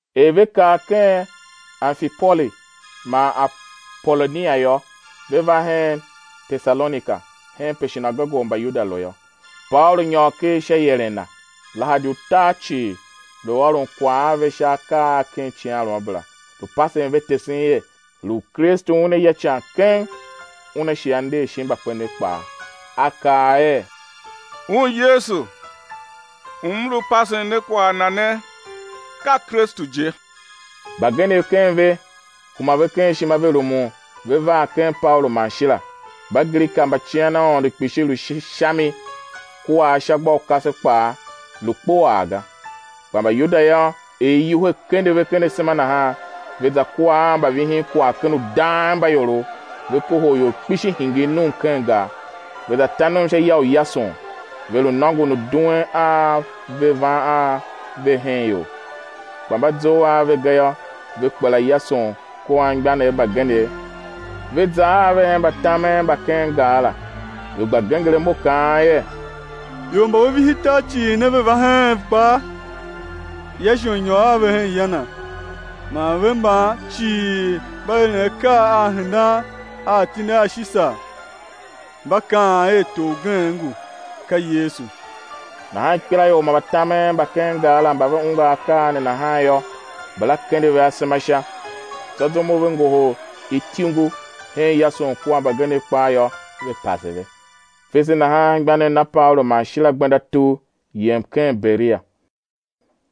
Er ve kar ken Amfipoli man Apolonia yô, ve va hen Tesalonika, henpe shinagoge u Mbayuda lu yô. Paulu nyôr ker sha ieren na, lahadi utar cii lu ôron kwagh a ve sha akaa a ken icighanruamabera, lu pasen ve tesen er, lu u Kristu Una ya ican keng, Una shi A nder shin mbakpenev kpaa. A kaa er: Un Yesu u m lu pasen ne kwagh Na ne, ka Kristu je. Mbagenev ken a ve, kuma ve ken ishima ve rumun ve var ken Paulu man Shila; Mbagrika mba cian Aôndo kpishi lu sha mi kua ashagbaukase kpaa lu kpuaa ga. Kpa Mbayuda yô, er iwuhe kende ve ken asema nahan, ve za kua a mbavihinkwagh ken udangmbaiorov, ve kohol ior kpishi hingir num ken gar, ve za ta num sha ya u Yason, ve lu nôngon u duen a ve van a ve hen ior. Kpa mba zough a ve ga yô, ve kpela Yason kua anmgbianev mbagenev, ve za a ve hen mbatamen mba ken gar la, ve gba genger imo kaan er: Ior mba ve vihi tar cii ne, ve va heen kpaa, Yason nyôr a ve hen ya na; man ve mban cii mba eren akaa a hendan a atindi a Shisar, mba kaan er tor ugen ngu, ka Yesu. Nahan ikpelaior man mbatamen mba ken gar la mba ve ungwa akaa ne nahan yô, mbala kende ve asema sha. Tsô zum u ve ngohol ityungu hen Yason kua mbagenev kpaa yô, ve pase ve. Fese nahan anmgbianev na Paulu man Shila gbenda tugh, yem ken Berea.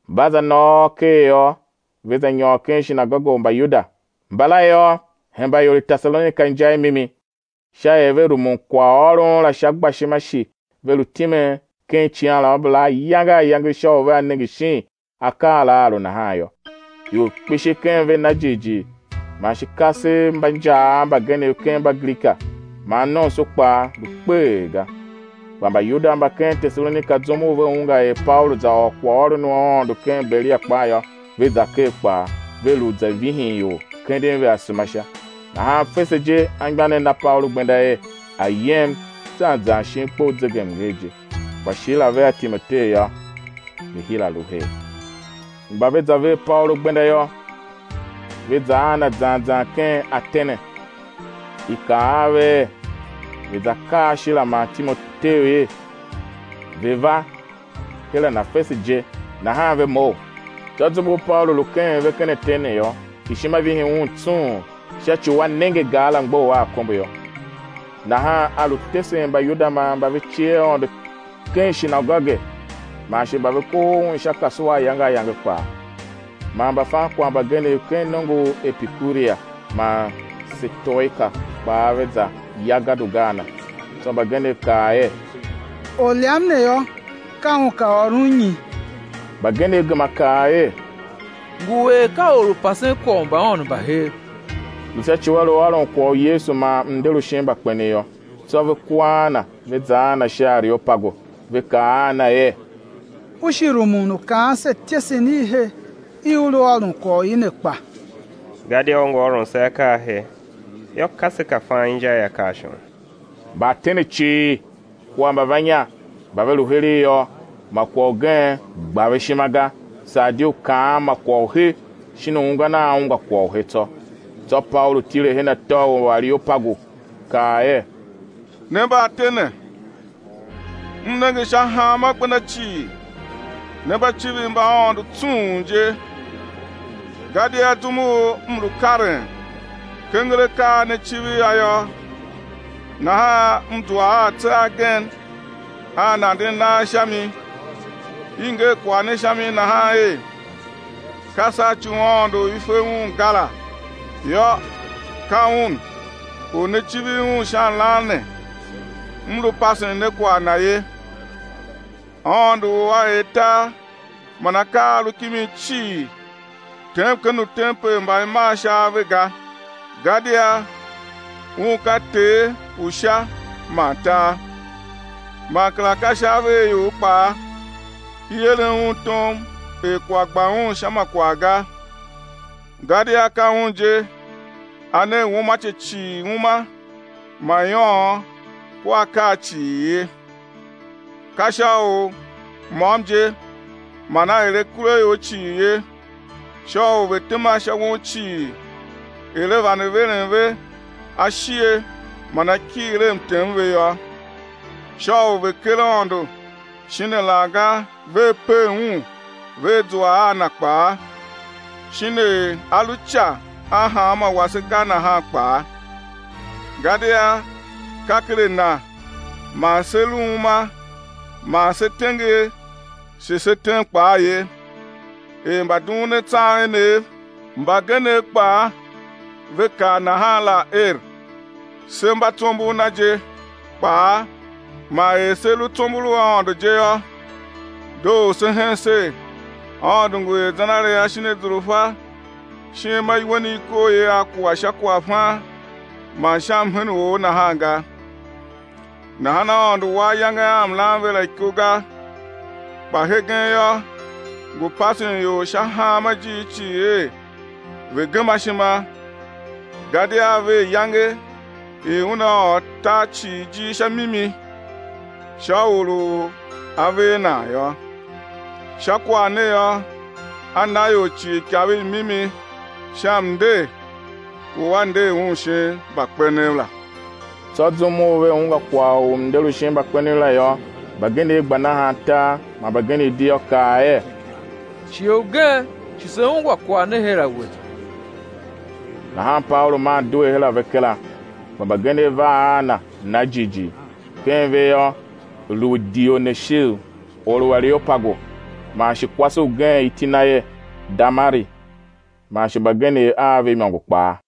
Mba za nôôr ker yô, ve za nyôr ken shinagoge u Mbayuda. Mbala yô, hemba ior i Tesalonika inja i mimi, sha er ve rumun kwaghôron la sha gbashima shi ve lu timen ken icighanruamabera ayange ayange sha u vea nenge shin akaa la aa lu nahan yô. Ior kpishi ken ve na jighjigh man shi kasev mba injaav mbagenev ken Mbagrika, man nomso kpaa, lu kpeghee ga. Kpa Mbayuda mba ken Tesalonika zum u ve ungwa er Paulu za ôr kwaghôron u Aôndo ken Berea kpaa yô, ve za ker kpaa, ve lu za vihin ior, kenden ve asema sha. Nahan fese je anmgbianev na Paulu gbenda er a̱ yem zan zan shin kpe u zegemnger je; kpa Shila vea Timoteu yô, ve hira lu her. Mba ve za ver Paulu gbenda yô, ve za a na zan zan ken Atene. I kaa a ve er ve̱ za kaa Shila man Timoteu er ve̱ va her a na fese je nahan ve mough. Tsô zum u Paulu lu keghen ve ken Atene yô, ishima vihi un tsung sha ci u a nenge gar la mgbough a akombo yô. Nahan a lu tesen Mbayuda man mba ve cie Aôndo ken shinagoge, man shi mba ve kohol un sha kasua ayange ayange kpaa. Man mbafankwagh mbagenev ken nongo u Epikuria man u Setoika kpaa ve za ya gadoga a na. Tsô mbagenev kaa er: Orlyam ne yô, ka un ka ôron nyi? Mbagenev gema kaa er: Ngu er ka or u pasen kwagh u mbaaôndo mba hev, lu sha ci u a lu ôron kwagh u Yesu man mnder u shin mbakpenev yô. Tsô ve kua a na, ve za a na sha Areopagu, ve kaa a na er: U shi rumun u kaan se ityesen i he i u lu ôron kwagh u i ne kpa? Gadia u ngu ôron se akaa a he; yô, ka se ka fan inja i akaa a shon. Mbaatene cii kua mbavannya mba ve lu heregh yô, ma kwagh ugen gba ve ishima ga, saa di u kaan ma kwagh u he shin u ungwan a ungwa kwagh u he tsô. Tsô Paulu tile her atô u Areopagu, kaa er: Ne Mbaatene, m nenge sha hanma gbenda cii, ne mba civir mbaaôndo tsung je, gadia zum u m lu karen, kenger akaa a ne civir a yô, nahan m zua a atse agen a nanden nagh sha mi, i nger kwagh ne sha mi nahan er: Ka sha ci u aôndo u i fe un ga la; yô, ka Un u ne civir Un sha lan ne m lu pasen ne kwagh Na ye. Aôndo u A er tar man akaa a a lu kimi cii, tem ken utempel mba i maa sha ave ga, gadia Un ka Ter u Sha man tar. Man kera ka sha ave a ior kpaa i eren Un tom er kwagh gba Un sha ma kwagh ga, gadia ka Un je A ne uumace cii uma man iôôn kua akaa cii ye. Ka sha u môm je man A er akuraior cii ye, sha u ve̱ tema sha won cii er A vande veren ve ashighe man akighir a mtem ve yô, sha u ve̱ ker Aôndo shin alaghga vea pev Un vea zua a Na kpaa, shin er A lu ica a hanmô wase ga nahan kpaa. Gadia ka ken a Na man se lu uma man se tenger shi se tem kpaa ye, er mbadughunatsam enev mbagenev kpaa ve kaa nahan la er: Se mba tsombor Na je kpaa. Man er se lu tsombor u Aôndo je yô, doo u sé hen ser, Aôndo ngu er zenaria shin azurfa shin ma iwen i i koo i a kua sha kwaghfan man sha mhen u or nahan ga. Nahan Aôndo wa ayange a mlan ve la iko ga; kpa hegen yô, ngu pasen ior sha hanma ijiir cii er ve̱ gema ishima, gadia A ver iyange i Una ôr tar cii ijir sha mimi, sha Or u A ver nan yô; sha kwagh ne yô, A na ior cii ikav i mimi sha mnder u A nder Un shin mbakpenev la. Tsô zum u ve ungwa kwagh u mnder u shin mbakpenev la yô, mbagenev gba nahan tar man mbagenev di yô, kaa er: Shighe ugen shi sé ungwa kwagh ne her a we. Nahan Paulu maa due her a ve kera. Kpa mbagenev var a na, na jighjigh; ken ve yô, lu Dioneshiu, or u Areopagu, man shi kwase ugen, iti na er Damari, man shi mbagenev a ve imôngo kpaa.